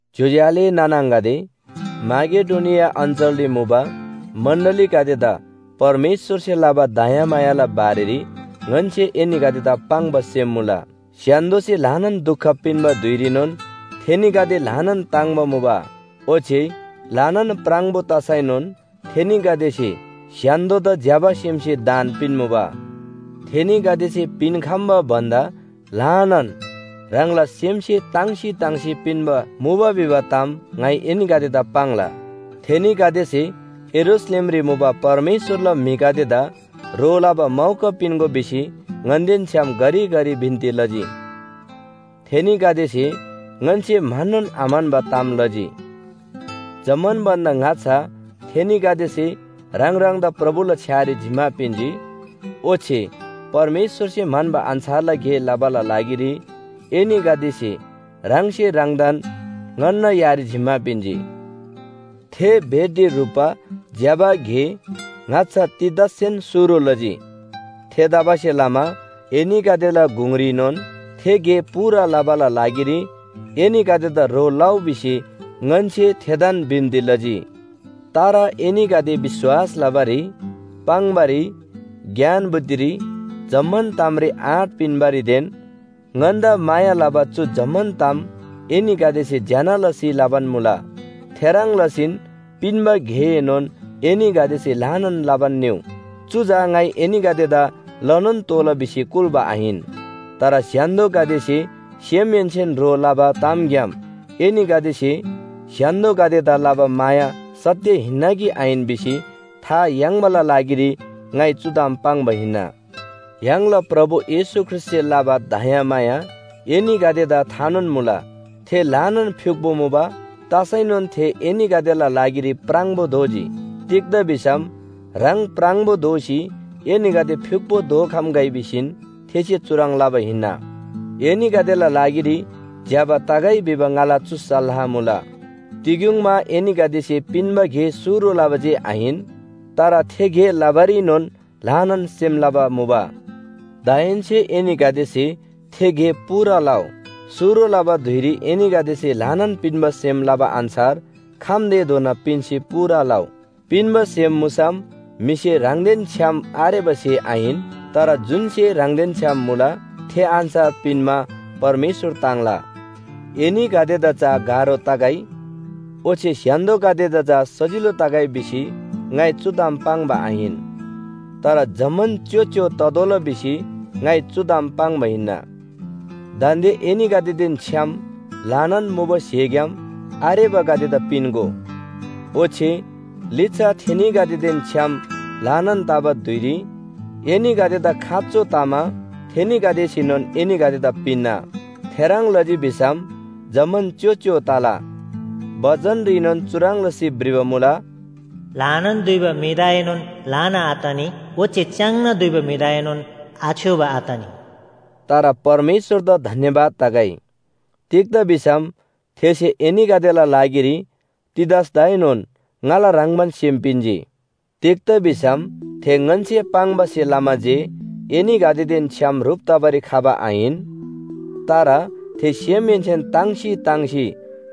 ज्‍योज्‍यो आले नाना आङागदे, माकेडोनिया अञ्‍चलरी मुबा मण्‍डलीगदेदा परमेश्‍वरसे लबा दयामायाला बारेरी ङन्‍से एनीगदेदा पाङ्बा सेम मुला। स्‍य्‍हान्‍दोसे ल्‍हानान दुख पिन्‍बा धुइरीनोन थेनीगदे ल्‍हानान ताङ्‍बा मुबा। ओच्‍छे ल्‍हानान प्राङबो तसैनोन थेनीगदेसे स्‍य्‍हान्‍दोदा ज्‍यबा सेमसे दान पिन्‍मुबा। थेनीगदेसे पिन्‍खम्‍बा भन्‍दा ल्‍हानान ह्राङला सेमहेन्‍से ताङ्सी ताङ्सी पिन्‍बा मुबा भिबा ताम ङाइ एनीगदेदा पाङ्ला। थेनीगदेसे यरूशलेमरी मुबा परमेश्‍वरला म्‍हिगदेदा ह्रो लबा मौका पिन्‍गो भिसी ङन्‍देन छ्‌याम घरिघरि बिन्‍ती लजी। थेनीगदेसे ङन्‍से म्‍हन्‍नोन आम्‍हन्‍बा ताम लजी। जम्‍मान भन्‍दा ङाच्‍छा थेनीगदेसे ह्राङ ह्राङदा प्रभुला छ्‌यारी जिम्‍मा पिन्‍जी, ओच्‍छे परमेश्‍वरसे म्‍हन्‍बा अन्‍छारला गे लबाला लागिरी एनीगदेसे ह्राङसे ह्राङदान ङन्‍ना यारी जिम्‍मा पिन्‍जी। थे भेटी ह्रुप्‍बा ज्‍यबा गे ङाच्‍छा तीतससेन शुरु लजी। थेतबासेलमा एनीगदेला गुङरीनोन थे गे पूरा लबाला लागिरी एनीगदेदा ह्रो लउ भिसी ङन्‍से थेदान बिन्‍ती लजी। तर एनीगदे विश्‍वास लबारी, पाङ्‌बारी, ज्ञान बुद्धिरी, जम्‍मान तामरी आँट पिन्‍बारीदेन ङन्‍दा माया लबा चु जम्‍मान ताम एनीगदेसे ज्‍यना लसी लबान मुला। थेह्रङ् लसीन पिन्‍बा गेएनोन एनीगदेसे ल्‍हानान लबान निउ। चु चा ङाइ एनीगदेदा लनोन तोःला भिसी कुल्‍बा आहिन। तर स्‍य्‍हान्‍दोगदेसे सेमहेन्‍सेन ह्रो लबा तामग्‍याम एनीगदेसे स्‍य्‍हान्‍दोगदेदा लबा माया सत्‍य हिन्‍ना कि आहिन भिसी था याङ्बाला लागिरी ङाइ चु ताम पाङ्बा हिन्‍ना। य्‍हाङला प्रभु येशू ख्रीष्‍टसे लबा दयामाया एनीगदेदा थानोन मुला। थे ल्‍हानान फ्‍युक्‍पो मुबा। तसैनोन थे एनीगदेला लागिरी प्राङबो दोजी। तिग्‍दा भिसम ह्राङ प्राङबो दोसी एनीगदे फ्‍युक्‍पो दोखम्‍गै भिसीन थेसे चुह्रङ् लबा हिन्‍ना। एनीगदेला लागिरी ज्‍यबा तगै भिबा ङाला चु सल्‍लाह मुला। तिग्‍युङमा एनीगदेसे पिन्‍बा गे शुरु लबा जे आहिन, तर थे गे लबारीनोन ल्‍हानान सेम लबा मुबा। दाहेन्‍से एनीगदेसे थे गे पूरा लउ। शुरु लबा धुइरी एनीगदेसे ल्‍हानान पिन्‍बा सेम लबा अन्‍छार खम्‍तेधोना पिन्‍सी पूरा लउ। पिन्‍बा सेम मुसम म्‍हिसे ह्राङदेन छ्‌याम आरेबा स्‍हे आहिन, तर जुन स्‍हे ह्राङदेन छ्‌याम मुला थे अन्‍छार पिन्‍मा परमेश्‍वर ताङ्ला। एनीगदेदा चा गाह्रो तगै, ओच्‍छे स्‍य्‍हान्‍दोगदेदा चा सजिलो तगै भिसी ङाइ चु ताम पाङ्बा आहिन। तर जम्‍मान च्‍योच्‍यो ततोःला भिसी ङाइ चु ताम पाङ्बा हिन्‍ना। दान्‍दे एनीगदेदेन छ्‌याम ल्‍हानान मुबा स्‍हेग्‍याम आरेबागदेदा पिन्‍गो। ओच्‍छे लिच्‍छा थेनीगदेदेन छ्‌याम ल्‍हानान तबा धुइरी एनीगदेदा खाँचो तमा थेनीगदेसेनोन एनीगदेदा पिन्‍ना। थेह्रङ् लजी भिसम जम्‍मान च्‍योच्‍यो तला। बचनरीनोन चुह्रङ् लसी भ्रिबा मुला, “ल्‍हानान दुइबा म्‍हिदाएनोन ल्‍हाना आतनी, ओच्‍छे च्‍याङ्ना दुइबा म्‍हिदाएनोन आछ्‌योबा आतनी।” तर परमेश्‍वरदा धन्‍यवाद तगै। तिग्‍दा भिसम थेसे एनीगदेला लागिरी तीतसदाएनोन ङाला ह्रङ्‌बान सेम पिन्‍जी। तिग्‍दा भिसम थे ङन्‍से पाङ्बासे लमा जे एनीगदेदेन छ्‌याम ह्रुप तबारी खबा आहिन, तर थे सेमहेन्‍सेन ताङ्सी ताङ्सी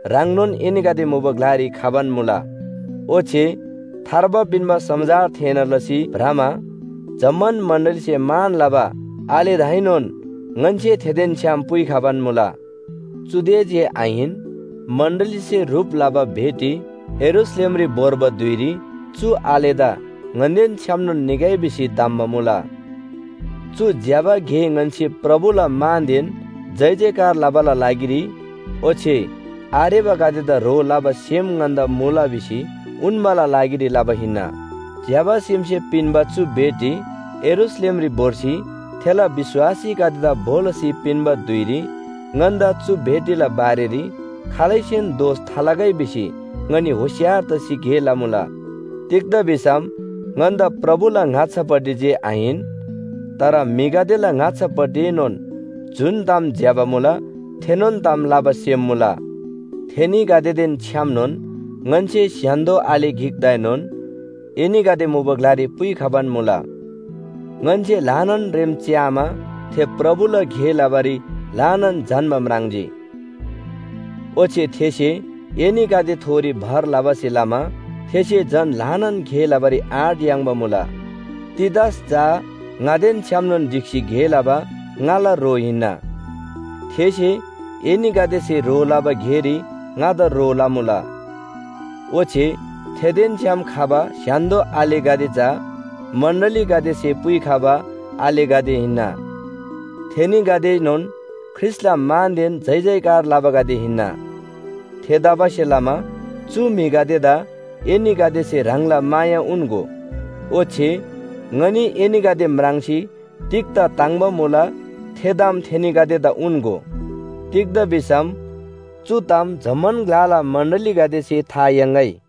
ह्राङनोन एनीगदे मुबा ग्‍लारी खबान मुला। ओच्‍छे थार्बा पिन्‍बा समाचार थेःना लसी भ्रमा जम्‍मान मण्‍डलीसे मान लबा आलेदाएनोन ङन्‍से थेदेन छ्‌याम पुइखबान मुला। चुदे जे आहिन, मण्‍डलीसे ह्रुप लबा भेटी यरूशलेमरी भोर्बा धुइरी चु आलेदा ङन्‍देन छ्‌यामनोन निगै भिसी धम्‍बा मुला। चु ज्‍यबा गे ङन्‍से प्रभुला मानदेन जयजयकार लबाला लागिरी ओच्‍छे आरेबागदेदा ह्रो लबा सेम ङन्‍दा मुला भिसी उन्‍बाला लागिरी लबा हिन्‍ना। ज्‍यबा सेमसे पिन्‍बा चु भेटी यरूशलेमरी भोर्सी थेला विश्‍वासीगदेदा भो लसी पिन्‍बा धुइरी ङन्‍दा चु भेटीला बारेरी खालैसेन दोष थालगै भिसी ङनी होशियार तसी गे लमुला। तिग्‍दा भिसम ङन्‍दा प्रभुला ङाच्‍छापट्टि जे आहिन, तर म्‍हिगदेला ङाच्‍छापट्टिएनोन जुन ताम ज्‍यबा मुला थेनोन ताम लबा सेम मुला। थेनीगदेदेन छ्‌यामनोन ङन्‍से स्‍य्‍हान्‍दो आले गिकदाएनोन एनीगदे मुबा ग्‍लारी पुइखबान मुला। ङन्‍से ल्‍हानान रेम च्‍यामा थे प्रभुला गे लबारी ल्‍हानान झन्‍बा म्राङ्जी। ओच्‍छे थेसे एनीगदेथोरी भर लबासे लमा थेसे झन ल्‍हानान गे लबारी आँट याङ्बा मुला। तीतस चा ङादेन छ्‌यामनोन ढिक्‍सी गे लबा ङाला ह्रो हिन्‍ना। थेसे एनीगदेसे ह्रो लबा गेरी ङादा ह्रो लमुला। ओच्‍छे थेदेन छ्‌याम खबा स्‍य्‍हान्‍दो आलेगदे चा मण्‍डलीगदेसे पुइखबा आलेगदे हिन्‍ना। थेनीगदेएनोन ख्रीष्‍टला मानदेन जयजयकार लबागदे हिन्‍ना। थेतबासेलमा चु म्‍हिगदेदा एनीगदेसे ह्राङला माया उन्‍गो। ओच्‍छे ङनी एनीगदे म्राङ्सी तिग्‍दा ताङ्‍बा मुला थे ताम थेनीगदेदा उन्‍गो। तिग्‍दा भिसम चु ताम जम्‍मान ग्‍लाला मण्‍डलीगदेसे था याङ्‌गै।